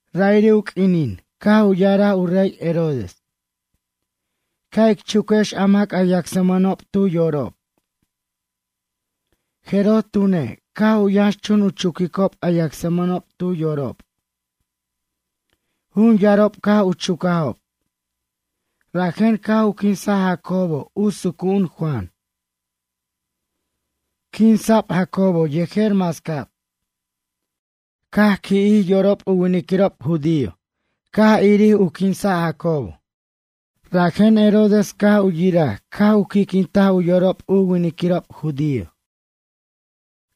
Ra'iri' u q'uinin, caj u ya'araj u rey Herodes: ―Ca' ic chuquex a mac a yacsmʌnob tu yorob. Jeroj tune', caj u yʌnxchun u chuquicob a yacsmʌnob tu yorob. Jun yarob caj u chucajob. Rajen caj u quinsaj Jacobo u sucu'un Juan. Quinsa'b Jacobo yejer mascab. Caj qui'jij yorob u winiquirob judío, caj irir u quinsa' Jacobo. Rajen Herodes caj u yiraj caj u qui'quintaj u yorob u winiquirob judío.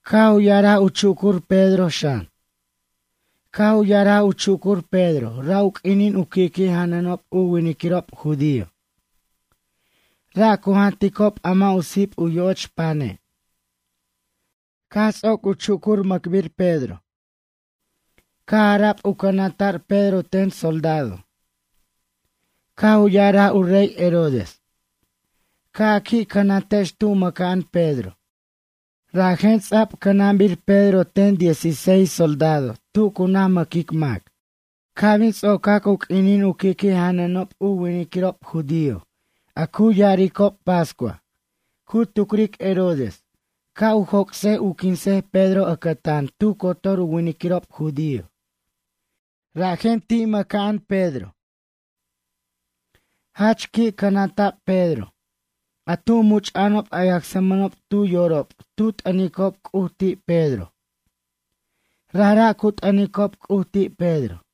Caj u ya'araj u chucur Pedro, xan. Caj u ya'araj u chucur Pedro ra' u q'uinin u qui'qui' janʌnob u winiquirob judío. Ra' cu janticob a mʌ' u sip u yoch pane'. Caj ts'oc u chucur u mʌcbir Pedro. Caj ara'b u cʌnanta'r Pedro ten soldado. Caj u ya'araj u rey Herodes: ―Ca' a qui' cʌnantex tu mʌca'an Pedro. Rajen ts'a'b cʌnabir Pedro ten diez y seis soldado tu cu naj mʌquic mac. Ca' bin ts'ocac u q'uinin u qui'qui' janʌnob u winiquirob judío a cu ya'aricob Pascua, cu tucric Herodes ca' joc'sej u quinsej Pedro ʌcʌtan tu cotor u winiquirob judío. Rajen ti' mʌca'ano' Pedro. Jach qui' cʌnanta'b Pedro. A tu much'a'anob a yacsmʌnob tu yorob tu t'ʌnicob C'uj ti' Pedro. Rajra' cu t'ʌnicob C'uj ti' Pedro.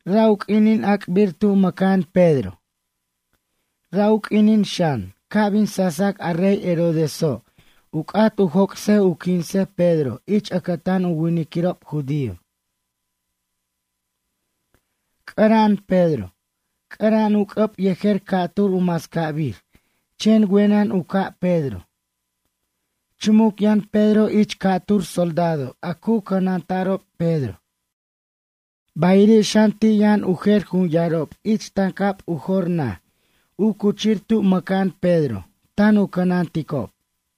Ra' u q'uinin ac'bir tu mʌca'an Pedro. Ra' u q'uinin xan, ca' bin sasac a rey Herodeso' u c'at u joc'sej u quinsej Pedro ich ʌcʌtan u winiquirob judío. C'ʌra'an Pedro. C'ʌra'an u c'ʌb yejer ca'tur u mascabir, chen wenʌn u ca' Pedro. Chumuc yʌn Pedro ich ca'tur soldado a cu cʌnanta'rob Pedro. Bayiri' xan ti' yʌn u jer jun yarob ich tancab u jor naj u cuchir tu mʌca'an Pedro tan u cʌnanticob.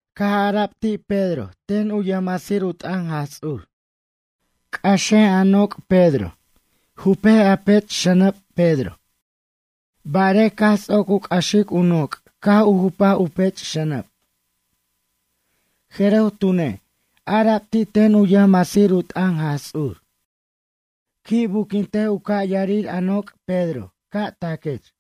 Caj ara'b ti' Pedro ten u yʌjmasir u t'ʌn Jaj Ts'ur: ―C'ʌxej a noc', Pedro. Jupej a pech xʌnʌb, Pedro. Barej, caj ts'oc u c'ʌxic u noc' caj u jupaj u pech xʌnʌb. Jeroj tune', ara'b ti' ten u yʌjmasir u t'ʌn Jaj Ts'ur: ―Qui' buquintej u ca' yarir a noc', Pedro, ca' taquech.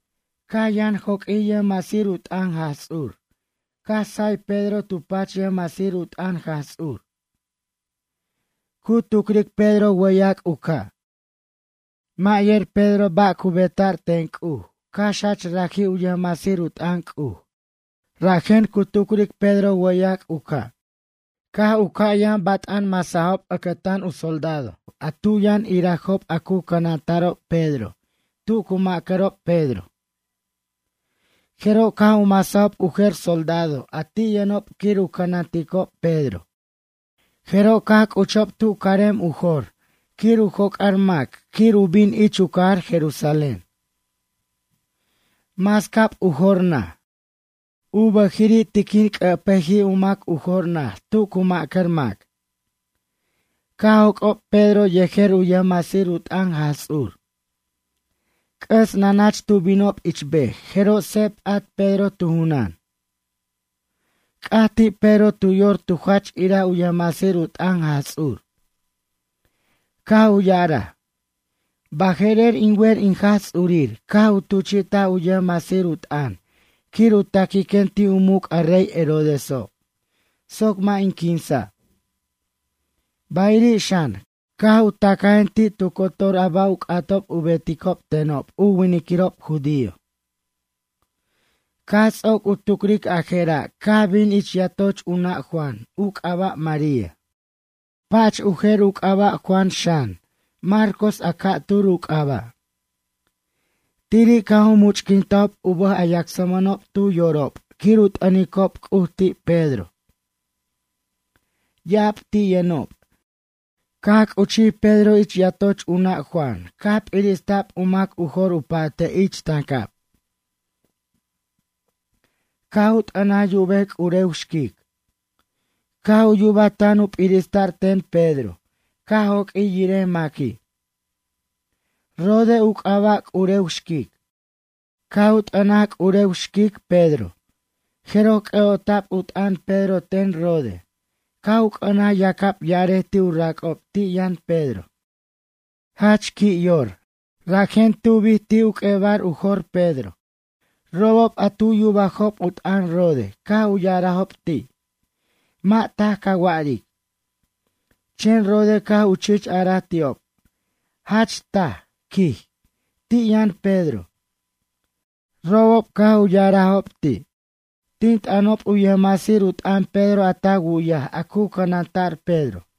Caj yʌn joq'uij yʌjmasir u t'ʌn Jaj Ts'ur, caj say Pedro tu pach yʌjmasir u t'ʌn Jaj Ts'ur. Cu tucric Pedro wʌyac' u ca'. Mʌ' yer Pedro ba' cu beta'r ten C'uj, cax jach raji' u yʌjmasir u t'ʌn C'uj, rajen cu tucric Pedro wʌyac'. Caj u ca' u yʌn bat'an masajob ʌcʌtan u soldado a tu yʌn irajob a cu cʌnanta'rob Pedro tu cu macʌrob Pedro. Jeroj caj u masajob u jer soldado a ti' yʌnob quir u cʌnanticob Pedro, jeroj caj c'uchob tu carem u jo'r quir u joc'ar mac quir u bin ich u cajar Jerusalén. Mascab u jor naj. U bʌjiri' tiquin q'uepʌjij u mac u jor naj tu cu macar mac. Caj joc'ob Pedro yejer u yʌjmasir u t'ʌn Jaj Ts'ur. C'ʌs nanach tu binob ich bej jeroj seb p'at Pedro tu junan. C'aj ti' Pedro tu yor tu jach iraj u yʌjmasir u t'ʌn Jaj Ts'ur. Caj u ya'araj: ―Baje'rer, in wer in Jaj Ts'urir caj u tuchi'taj u yʌjmasir u t'ʌn quir u taquiquen ti' u muc' a rey Herodeso' soc mʌ' in quinsa'. Bayiri' xan, caj u tacajen ti' tu cotor a ba' u c'atob u beticob tenob u winiquirob judío. Caj ts'oc u tucric a jera' caj bin ich yatoch u nʌ' Juan, u c'aba' María. Pach u jer u c'aba' Juan xan, Marcos a ca'tur u c'aba'. Tiri' caj u much'quintajob u bʌj a yacsmʌnob tu yorob quir u t'ʌnicob C'uj ti' Pedro. Ya'ab ti' yʌnob. Caj c'uchij Pedro ich yatoch u nʌ' Juan caj p'irista'b u mac u jor u pa'te' ich tancab. Caj u t'ʌnaj yubej c'urew xquic. Caj u yubaj tan u p'irista'r ten Pedro, caj joq'uij yirej maqui'. Rode u c'aba' c'urew xquic. Caj u t'ʌnaj c'urew xquic, Pedro, jeroj c'ʌ'ota'b u t'ʌn Pedro ten Rode, caj u c'ʌnaj yacab ya'arej ti' u rac'ob ti' yʌn Pedro. Jach qui' yor, rajen tubij ti' u q'uebar u jor Pedro. Robob a tu yubajob u t'ʌn Rode caj u ya'arajob ti': ―Mʌ' taj ca wa'aric. Chen Rode caj u chich araj ti'ob: ―Jach taj ―quij―, ti' yʌn Pedro. Robob caj u ya'arajob ti': ―Tin t'ʌnob u yʌjmasir u t'ʌn Pedro a ta wu'yaj a cu cʌnanta'r Pedro.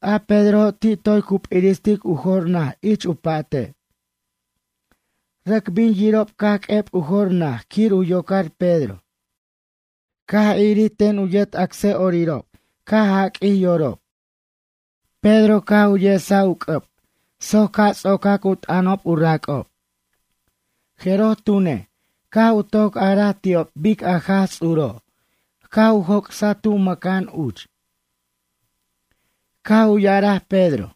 A Pedrojo' ti' toy cu p'iristic u jor naj ich u pa'te'. Rʌc bin yiricob caj q'ueb u jor naj quir u yocar Pedro. Caj irir ten u yet acsa'orirob, caj jaq'uij yorob. Pedro caj u yesaj u c'ʌb soc ca' ts'ocac u t'ʌnob u rac'ob. Jeroj tune', caj u toc araj ti'ob bic a Jaj Ts'uro', caj u joc'saj tu mʌca'an uch. Caj u ya'araj Pedro: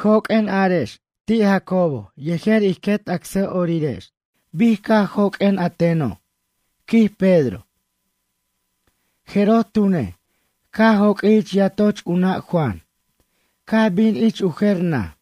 ―Joq'uen, arex ti' Jacobo yejer ij quet acsa'orirex bic caj joq'uen a teno' ―quij Pedro. Jeroj tune', caj joq'uij ich yatoch u nʌ' Juan, caj bin ich u jer naj.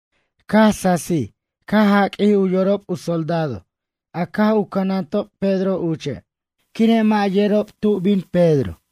Caj sasij caj jaq'uij u yorob u soldado a caj u cʌnantob Pedro uche', quire' mʌ' yerob tu bin Pedro.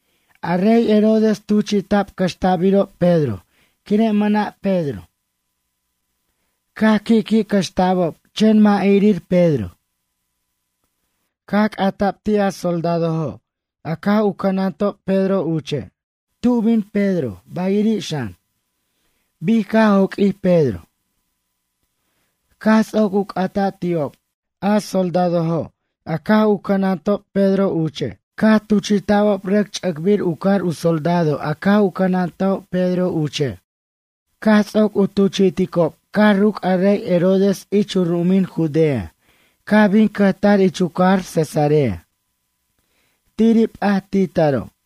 A rey Herodes tuchi'ta'b cʌxta'birob Pedro quire' mʌna' Pedro. Caj qui'qui' cʌxta'bob, chen mʌ' irir Pedro. Caj c'ata'b ti' a soldadojo' a caj u cʌnantob Pedro uche' tu bin Pedro, bayiri' xan, bic caj joq'uij Pedro. Caj ts'oc u c'ata' ti'ob, a soldado a caj u cʌnantob Pedro uche' caj tuchi'ta'bob rʌc ch'ʌcbir u car u soldado a caj u cʌnantob Pedro uche'. Caj ts'oc u tuchi'ticob caj ruc' a rey Herodes ich u ru'umin Judea, caj bin cʌjtar ich u cajar Cesarea. Tiri' p'at ti taro'.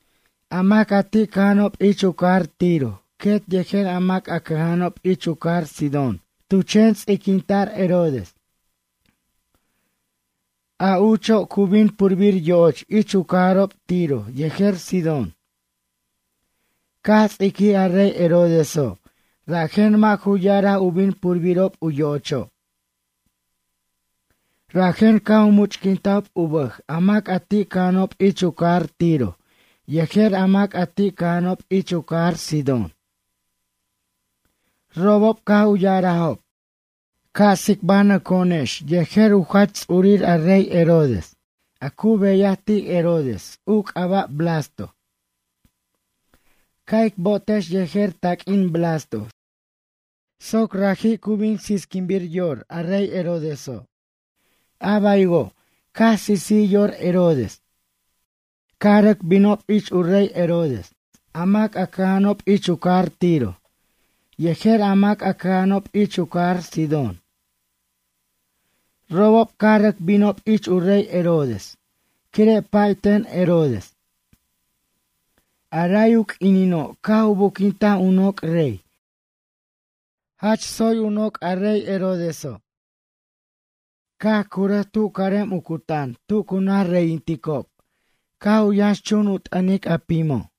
A mac a ti' cʌja'anob ich u cajar Tiro, quet yejer a mac a cʌja'anob ich u cajar Sidón tu chen ts'iquinta'r Herodes. A ucho', cu bin purbir yo'och ich u cajarob Tiro yejer Sidón. Caj ts'iquij a rey Herodeso', rajen mʌ' ju ya'ara' u bin purbirob yo'ocho'. Rajen caj u much'quintajob u bʌj a mac a ti' cʌja'anob ich u cajar Tiro yejer a mac a ti' cʌja'anob ich u cajar Sidón. Robob caj u ya'arajob: ―Ca' tsicbanʌco'onex yejer u jach ts'urir a rey Herodes a cu beyaj ti' Herodes, u c'aba' Blasto. Ca' ic bo'otex yejer taq'uin Blasto soc raji' cu bin sisquinbir yor a rey Herodeso'. A baywo', caj sisij yor Herodes. Caj rʌc binob ich u rey Herodes, a mac cʌja'anob ich u cajar Tiro, yejer a mac a cʌja'anob ich u cajar Sidón. Robob, caj rʌc binob ich u rey Herodes, quire' pay ten Herodes. A ray u q'uinino', caj u buquintaj u noc' rey, jach tsoy u noc' a rey Herodeso'. Caj curʌj tu carem u cutan tu cu naj reyinticob, caj u yʌnxchun u t'ʌnic a pimo'.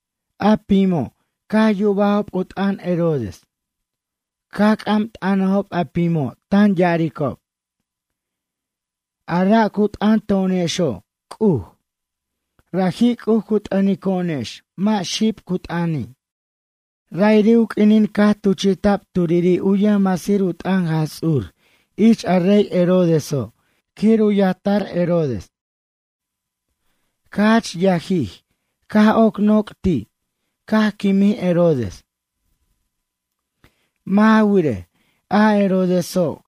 A pimo', caj yubajob u t'ʌn Herodes. Caj c'am t'ʌnajob a pimo', tan ya'aricob: ―A ra' cu t'ʌn to'onexo', c'uj. Raji' c'uj cu t'ʌnico'onex, mʌ' xib cu t'ʌni'. Ra'iri' u q'uinin caj tuchi'ta'b turiri' u yʌjmasir u t'ʌn Jaj Ts'ur ich a rey Herodeso' quir u yajtar Herodes. Caj jach yajij, caj oc noc' ti', caj quimij Herodes. Mʌ' ja wirej, a Herodeso',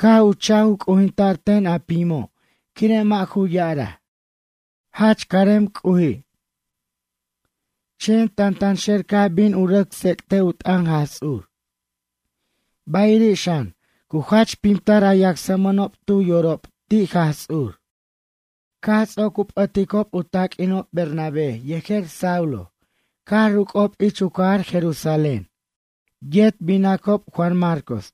caj u cha'j u c'ujinta'r ten a pimo', quire' mʌ' ju ya'araj: ―Jach carem C'uji'. Chen tantanxer, caj bin u rʌc tsec't u t'ʌn Jaj Ts'ur. Bayiri' xan, cu jach pimtar a yacsmʌnob tu yorob ti' Jaj Ts'ur. Caj ts'oc u p'ʌticob u taq'uinob Bernabé yejer Saulo, caj ruc'ob ich u cajar Jerusalén. Yet binacob Juan Marcos.